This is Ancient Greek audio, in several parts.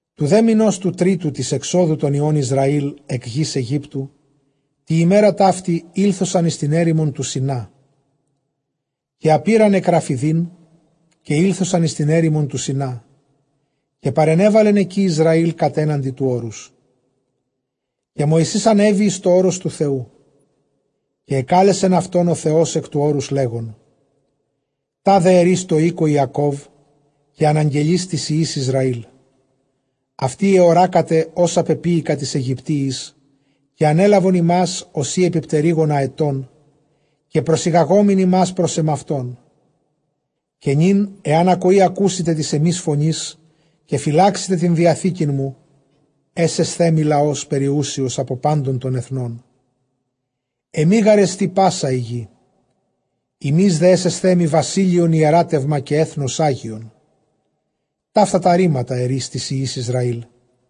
Τοῦ δὲ μηνὸς τοῦ τρίτου τῆς ἐξόδου τῶν υἱῶν Ἰσραὴλ ἐκ γῆς Αἰγύπτου τῇ ἡμέρᾳ ταύτῃ, ἤλθοσαν εἰς τὴν ἔρημον τοῦ Σινά. Καὶ ἀπῆραν ἐκ Ῥαφιδεὶν, καὶ ἤλθοσαν εἰς τὴν ἔρημον τοῦ Σινὰ, καὶ παρενέβαλεν ἐκεῖ Ἰσραὴλ κατέναντι τοῦ ὄρους. Καὶ Μωυσῆς ἀνέβη εἰς τὸ ὄρος τοῦ Θεοῦ· καὶ ἐκάλεσεν αὐτὸν ὁ Θεὸς ἐκ τοῦ ὄρους, λέγων, τάδε ἐρεῖς τῷ οἴκῳ Ἰακὼβ, καὶ ἀναγγελεῖς τοῖς υἱοῖς Ἰσραήλ. Αὐτοὶ ἑωράκατε ὅσα πεποίηκα τοῖς Αἱγυπτίοις, καὶ ἀνέλαβον ὑμᾶς ὡσεὶ ἐπὶ πτερύγων ἀετῶν, καὶ προσηγαγόμην ὑμᾶς πρὸς ἐμαυτόν. Καὶ νῦν ἐὰν ἀκοῇ ἀκούσητε τῆς ἐμῆς φωνῆς, καὶ φυλάξητε τὴν διαθήκην μου, ἔσεσθέ μοι λαὸς περιούσιος ἀπὸ πάντων τῶν ἐθνῶν· ἐμὴ γάρ ἐστι πᾶσα ἡ γῆ. Ὑμεῖς δὲ ἔσεσθέ μοι βασίλειον ἱεράτευμα καὶ ἔθνος ἅγιον· ταῦτα τὰ ῥήματα ἐρεῖς τοῖς υἱοῖς Ἰσραήλ.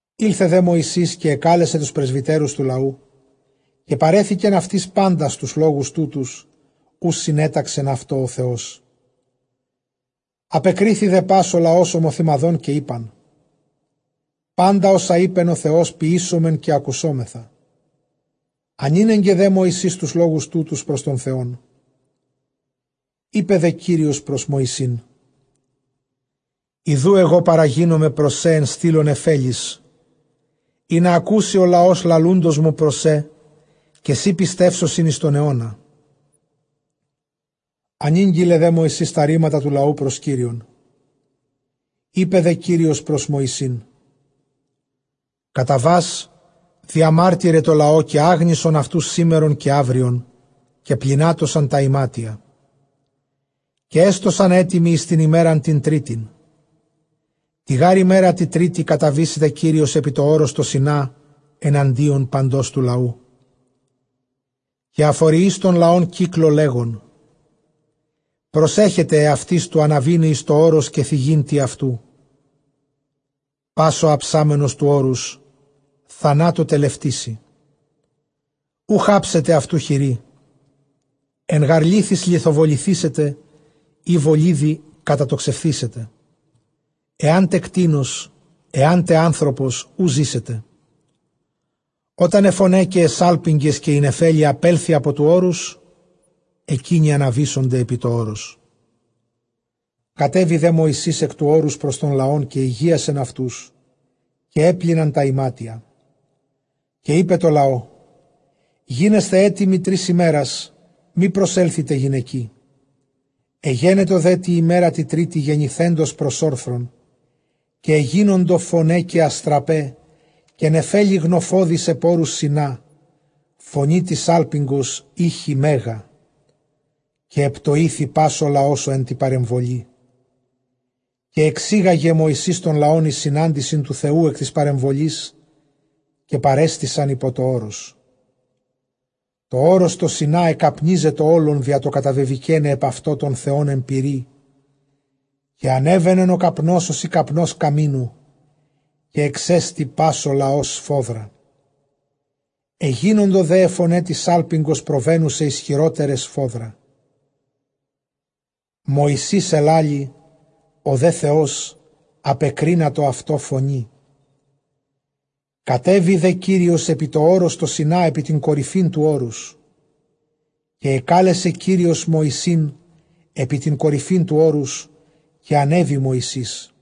Ἦλθε δὲ Μωυσῆς, καὶ ἐκάλεσεν τοὺς πρεσβυτέρους τοῦ λαοῦ· καὶ παρέθηκεν αὐτοῖς πάντας τοὺς λόγους τούτους, οὓς συνέταξεν αὐτοῖς ὁ Θεός. Ἀπεκρίθη δὲ πᾶς ὁ λαὸς ὁμοθυμαδὸν, καὶ εἶπαν, πάντα ὅσα εἶπεν ὁ Θεὸς, ποιήσομεν καὶ ἀκουσόμεθα· ἀνήνεγκε δὲ Μωυσῆς τοὺς λόγους τούτους πρὸς τὸν Θεόν. Εἶπε δὲ Κύριος πρὸς Μωυσῆν, ἰδοὺ ἐγὼ παραγίνομαι πρὸς σὲ ἐν στύλῳ νεφέλης, ἵνα ἀκούσῃ ὁ λαὸς λαλοῦντός μου πρὸς σὲ, καὶ σοὶ πιστεύσωσιν εἰς τὸν αἰῶνα· ἀνήγγειλε δὲ Μωυσῆς τὰ ῥήματα τοῦ λαοῦ πρὸς Κύριον. Εἶπε δὲ Κύριος πρὸς Μωυσῆν, Καταβὰς διαμάρτυραι τῷ λαῷ, καὶ ἅγνισον αὐτοὺς σήμερον καὶ αὔριον, καὶ πλυνάτωσαν τὰ ἱμάτια, καὶ ἔστωσαν ἕτοιμοι εἰς τὴν ἡμέραν τὴν τρίτην· τῇ γὰρ ἡμέρᾳ τῇ τρίτῃ καταβήσεται Κύριος ἐπὶ τὸ ὄρος τὸ Σινὰ, ἐναντίον παντὸς τοῦ λαοῦ. Καὶ ἀφοριεῖς τὸν λαὸν κύκλῳ, λέγων, προσέχετε ἑαυτοῖς τοῦ ἀναβῆναι εἰς τὸ ὄρος, καὶ θίγειν τι αὐτοῦ· πᾶς ὁ ἁψάμενος τοῦ ὄρους, θανάτῳ τελευτήσει. Οὐχ ἅψεται αὐτοῦ χείρ· ἐν γὰρ λίθοις λιθοβοληθήσεται, ἢ βολίδι κατατοξευθήσεται· ἐάν τε κτῆνος ἐάν τε ἄνθρωπος, οὐ ζήσεται· ὅταν αἱ φωναὶ καὶ αἱ σάλπιγγες καὶ ἡ νεφέλη ἀπέλθῃ ἀπὸ τοῦ ὄρους, ἐκεῖνοι ἀναβήσονται ἐπὶ τὸ ὄρος. Κατέβη δὲ Μωυσῆς ἐκ τοῦ ὄρους πρὸς τὸν λαὸν, καὶ ἡγίασεν αὐτούς· καὶ ἔπλυναν τὰ ἱμάτια. Καὶ εἶπε τῷ λαῷ, γίνεσθε ἕτοιμοι, τρεῖς ἡμέρας μὴ προσέλθητε γυναικί. Ἐγένετο δὲ τῇ ἡμέρᾳ τῇ τρίτῃ γενηθέντος πρὸς ὄρθρον, καὶ ἐγένοντο φωναὶ καὶ ἀστραπαὶ καὶ νεφέλη γνοφώδης ἐπʼ ὄρους Σινά· φωνὴ τῆς σάλπιγγος ἤχει μέγα· καὶ ἐπτοήθη πᾶς ὁ λαὸς ὁ ἐν τῇ παρεμβολῇ. Καὶ ἐξήγαγε Μωυσῆς τὸν λαὸν εἰς συνάντησιν τοῦ Θεοῦ ἐκ τῆς παρεμβολῆς· καὶ παρέστησαν ὑπὸ τὸ ὄρος. Τὸ ὄρος τὸ Σινὰ ἐκαπνίζετο ὅλον, διὰ τὸ καταβεβηκέναι ἐπʼ αὐτὸ τὸν Θεὸν ἐν πυρί· καὶ ἀνέβαινεν ὁ καπνὸς, ὡσεὶ καπνὸς καμίνου· καὶ ἐξέστη πᾶς ὁ λαὸς σφόδρα. Ἐγίνοντο δὲ αἱ φωναὶ τῆς σάλπιγγος προβαίνουσαι ἰσχυρότεραι σφόδρα. Μωυσῆς ἐλάλησεν, ὁ δὲ Θεὸς ἀπεκρίνατο αὐτῷ φωνῇ. Κατέβη δὲ Κύριος ἐπὶ τὸ ὄρος τὸ Σινὰ ἐπὶ τὴν κορυφὴν τοῦ ὄρους· καὶ ἐκάλεσε Κύριος Μωυσῆν ἐπὶ τὴν κορυφὴν τοῦ ὄρους· καὶ ἀνέβη Μωυσῆς.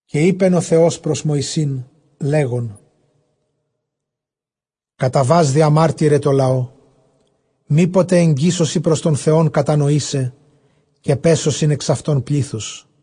Καὶ εἶπεν ὁ Θεὸς πρὸς Μωυσῆν, λέγων, καταβὰς διαμάρτυραι τῷ λαῷ, μή ποτε ἐγγίσωσι πρὸς τὸν Θεὸν κατανοῆσαι, καὶ πέσωσιν ἐξ αὐτῶν πλῆθος·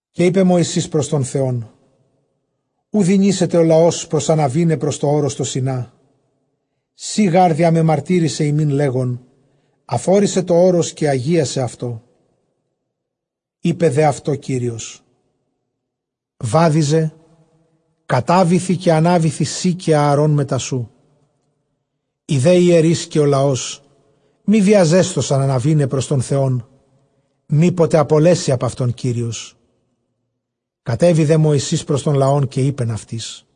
Καὶ εἶπε Μωυσῆς πρὸς τὸν Θεὸν, οὐ δυνήσεται ὁ λαὸς προσαναβῆναι πρὸς τὸ ὄρος τὸ Σινά· σὺ γὰρ διαμεμαρτύρησαι ἡμῖν, λέγων, ἀφόρισαι τὸ ὄρος, καὶ ἁγίασαι αὐτό. Εἴπε δὲ αὐτῷ Κύριος, βάδιζε, κατάβηθι, καὶ ἀνάβηθι σὺ καὶ Ἀαρὼν μετὰ σοῦ· οἱ δὲ ἱερεῖς καὶ ὁ λαὸς μὴ βιαζέσθωσαν ἀναβῆναι πρὸς τὸν Θεὸν, μὴ ποτε ἀπολέσῃ ἀπʼ αὐτῶν Κύριος. Κατέβη δὲ Μωυσῆς πρὸς τὸν λαὸν, καὶ εἶπεν αὐτοῖς.